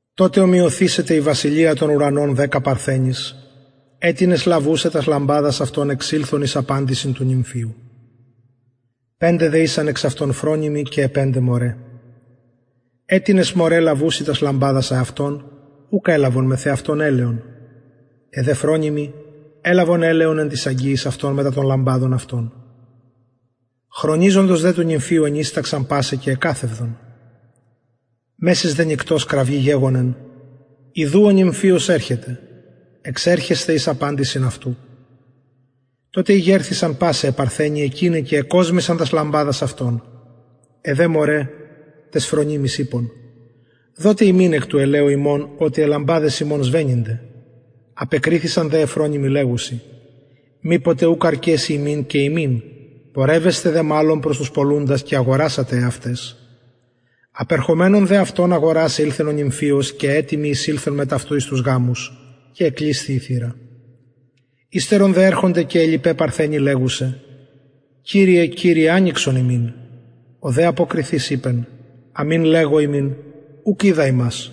τοτε ομοιωθησεται η βασιλεια των ουρανων δεκα παρθενοις αιτινες λαβουσαι τας λαμπαδας αυτων εξηλθον εις απαντησιν του νυμφιου πεντε δε ησαν εξ αυτων φρονιμοι και αι πεντε μωραι αιτινες μωραι λαβουσαι τας λαμπαδας αυτων ουκ ελαβον μεθ εαυτων ελαιον αι δε φρονιμοι ελαβον ελαιον εν τοις αγγειοις αυτων μετα των λαμπαδων αυτων χρονιζοντος δε του νυμφιου ενυσταξαν πασαι και εκαθευδον μεσης δε νυκτος κραυγη γεγονεν ιδου ο νυμφιος ερχεται εξερχεσθε εις απαντησιν αυτου τοτε ηγερθησαν πασαι αι παρθενοι εκειναι και εκοσμησαν τας λαμπαδας αυτων αι δε μωραι ταις φρονιμοις ειπον δοτε ημιν εκ του ελαιου υμων οτι αι λαμπαδες ημων σβεννυνται απεκριθησαν δε αι φρονιμοι λεγουσαι μηποτε ουκ αρκεση ημιν και υμιν πορευεσθε δε μαλλον προς τους πωλουντας και αγορασατε εαυταις απερχομενων δε αυτων αγορασαι ηλθεν ο νυμφιος και αι ετοιμοι εισηλθον μετ αυτου εις τους γαμους και εκλεισθη η θυρα υστερον δε ερχονται και αι λοιπαι παρθενοι λεγουσαι κυριε κυριε ανοιξον ημιν ο δε αποκριθεις ειπεν αμην λεγω υμιν ουκ οιδα υμας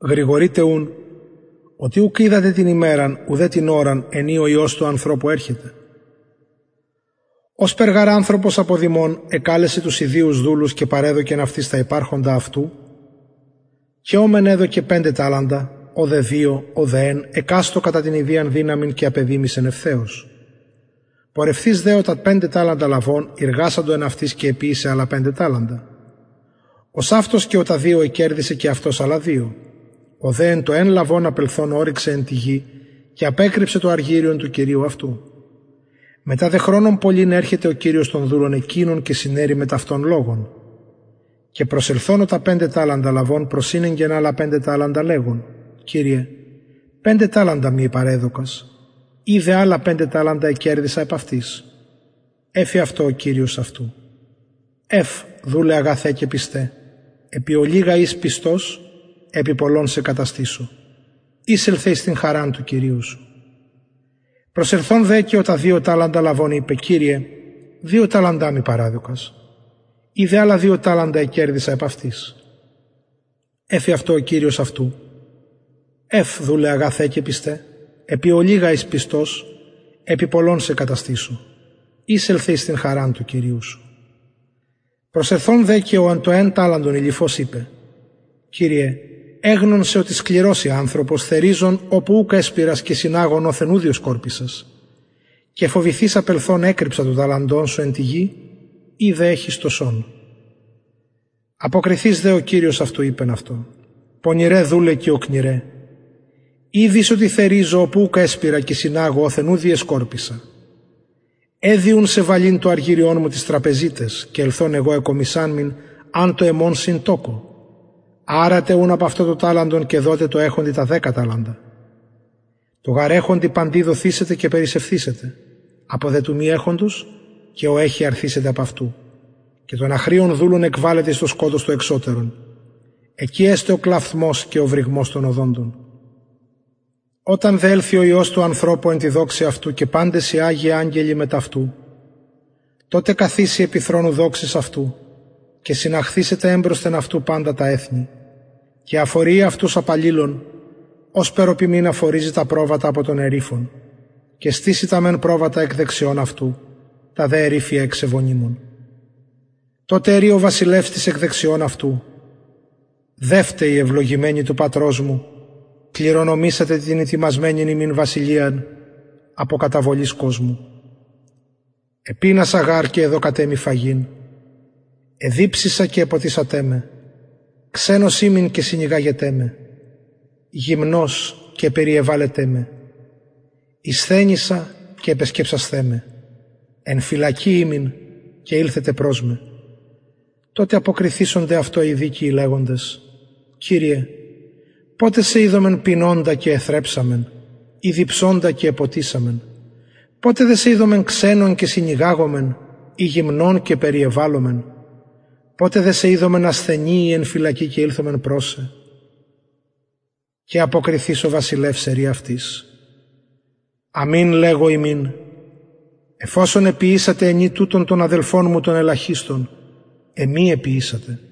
γρηγορειτε ουν οτι ουκ οιδατε την ημεραν ουδε την ωραν εν η ο υιος του ανθρωπου ερχεται ωσπερ γαρ ανθρωπος αποδημων εκαλεσεν τους ιδιους δουλους και παρεδωκεν αυτοις τα υπαρχοντα αυτου και ω μεν εδωκεν πεντε ταλαντα ω δε δυο ω δε εν εκαστω κατα την ιδιαν δυναμιν και απεδημησεν ευθεως πορευθεις δε ο τα πεντε ταλαντα λαβων ειργασατο εν αυτοις και εποιησεν αλλα πεντε ταλαντα ωσαυτως και ο τα δυο εκερδησεν και αυτος αλλα δυο ο δε το εν λαβων απελθων ωρυξεν εν τη γη και απεκρυψεν το αργυριον του κυριου αυτου μετα δε χρονον πολυν ερχεται ο κυριος των δουλων εκεινων και συναιρει μετ αυτων λογον και προσελθων ο τα πεντε ταλαντα λαβων προσηνεγκεν αλλα πεντε ταλαντα λεγων κυριε πεντε ταλαντα μοι παρεδωκας ιδε αλλα πεντε ταλαντα εκερδησα επ αυτοις εφη δε αυτω ο κυριος αυτου ευ δουλε αγαθε και πιστε επι ολιγα ης πιστος επι πολλων σε καταστησω εισελθε εις την χαραν του κυριου σου προσελθων δε και ο τα δυο ταλαντα λαβων ειπεν κυριε δυο ταλαντα μοι παρεδωκας ιδε αλλα δυο ταλαντα εκερδησα επ αυτοις εφη αυτω ο κυριος αυτου ευ δουλε αγαθε και πιστε επι ολιγα ης πιστος επι πολλων σε καταστησω εισελθε εις την χαραν του κυριου σου προσελθων δε και ο το εν ταλαντον ειληφως ειπεν κυριε εγνων σε οτι σκληρος ει ανθρωπος θεριζων οπου ουκ εσπειρας και συναγων οθεν ου διεσκορπισας και φοβηθεις απελθων εκρυψα το ταλαντον σου εν τη γη ιδε εχεις το σον αποκριθεις δε ο κυριος αυτου ειπεν αυτω πονηρε δουλε και οκνηρε ηδεις οτι θεριζω οπου ουκ εσπειρα και συναγω οθεν ου διεσκορπισα εδει ουν σε βαλειν το αργυριον μου τοις τραπεζιταις και ελθων εγω εκομισαμην αν το εμον συν τοκω αρατε ουν απ αυτου το ταλαντον και δοτε τω εχοντι τα δεκα ταλαντα τω γαρ εχοντι παντι δοθησεται και περισσευθησεται απο δε του μη εχοντος και ο εχει αρθησεται απ αυτου και τον αχρειον δουλον εκβαλετε εις το σκοτος το εξωτερον εκει εσται ο κλαυθμος και ο βρυγμος των οδοντων οταν δε ελθη ο υιος του ανθρωπου εν τη δοξη αυτου και παντες οι αγιοι αγγελοι μετ αυτου τοτε καθισει επι θρονου δοξης αυτου και συναχθησεται εμπροσθεν αυτου παντα τα εθνη και αφοριει αυτους απ αλληλων ωσπερ ο ποιμην αφοριζει τα προβατα απο των εριφων και στησει τα μεν προβατα εκ δεξιων αυτου τα δε εριφια εξ ευωνυμων τοτε ερει ο βασιλευς τοις εκ δεξιων αυτου δευτε οι ευλογημενοι του πατρος μου κληρονομησατε την ητοιμασμενην υμιν βασιλειαν απο καταβολης κοσμου επεινασα γαρ και εδωκατε μοι φαγειν εδιψησα και εποτισατε με ξενος ημην και συνηγαγετε με γυμνος και περιεβαλετε με ησθενησα και επεσκεψασθε με εν φυλακη ημην και ηλθετε προς με τοτε αποκριθησονται αυτω οι δικαιοι λεγοντες κυριε ποτε σε ειδομεν πεινωντα και εθρεψαμεν η διψωντα και εποτισαμεν ποτε δε σε ειδομεν ξενον και συνηγαγομεν η γυμνον και περιεβαλομεν ποτε δε σε ειδομεν ασθενη η εν φυλακη και ηλθομεν προς σε και αποκριθεις ο βασιλευς ερει αυτοις αμην λεγω υμιν εφ οσον εποιησατε ενι τουτων των αδελφων μου των ελαχιστων εμοι εποιησατε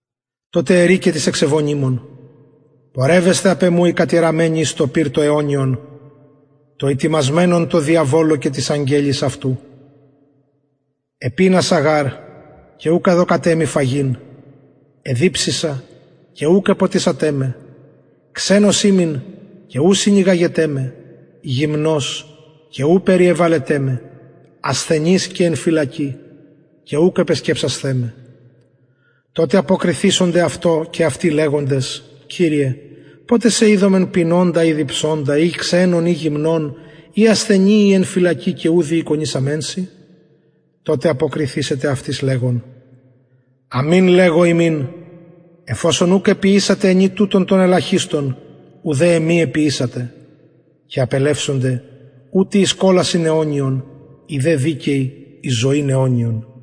τοτε ερει και τοις εξ ευωνυμων πορευεσθε απ εμου οι κατηραμενοι εις το πυρ το αιωνιον το ητοιμασμενον τω διαβολω και τοις αγγελοις αυτου επεινασα γαρ και ουκ εδωκατε μοι φαγειν εδιψησα και ουκ εποτισατε με ξενος ημην και ου συνηγαγετε με γυμνος και ου περιεβαλετε με ασθενης και εν φυλακη και ουκ επεσκεψασθε με τοτε αποκριθησονται και αυτοι λεγοντες κυριε ποτε σε ειδομεν πεινωντα η διψωντα η ξενον η γυμνον η ασθενη η εν φυλακη και ου διηκονησαμεν σοι τοτε αποκριθησεται αυτοις λεγων αμην λεγω υμιν εφ οσον ουκ εποιησατε ενι τουτων των ελαχιστων ουδε εμοι εποιησατε και απελευσονται ουτοι εις κολασιν αιωνιον οι δε δικαιοι εις ζωην αιωνιον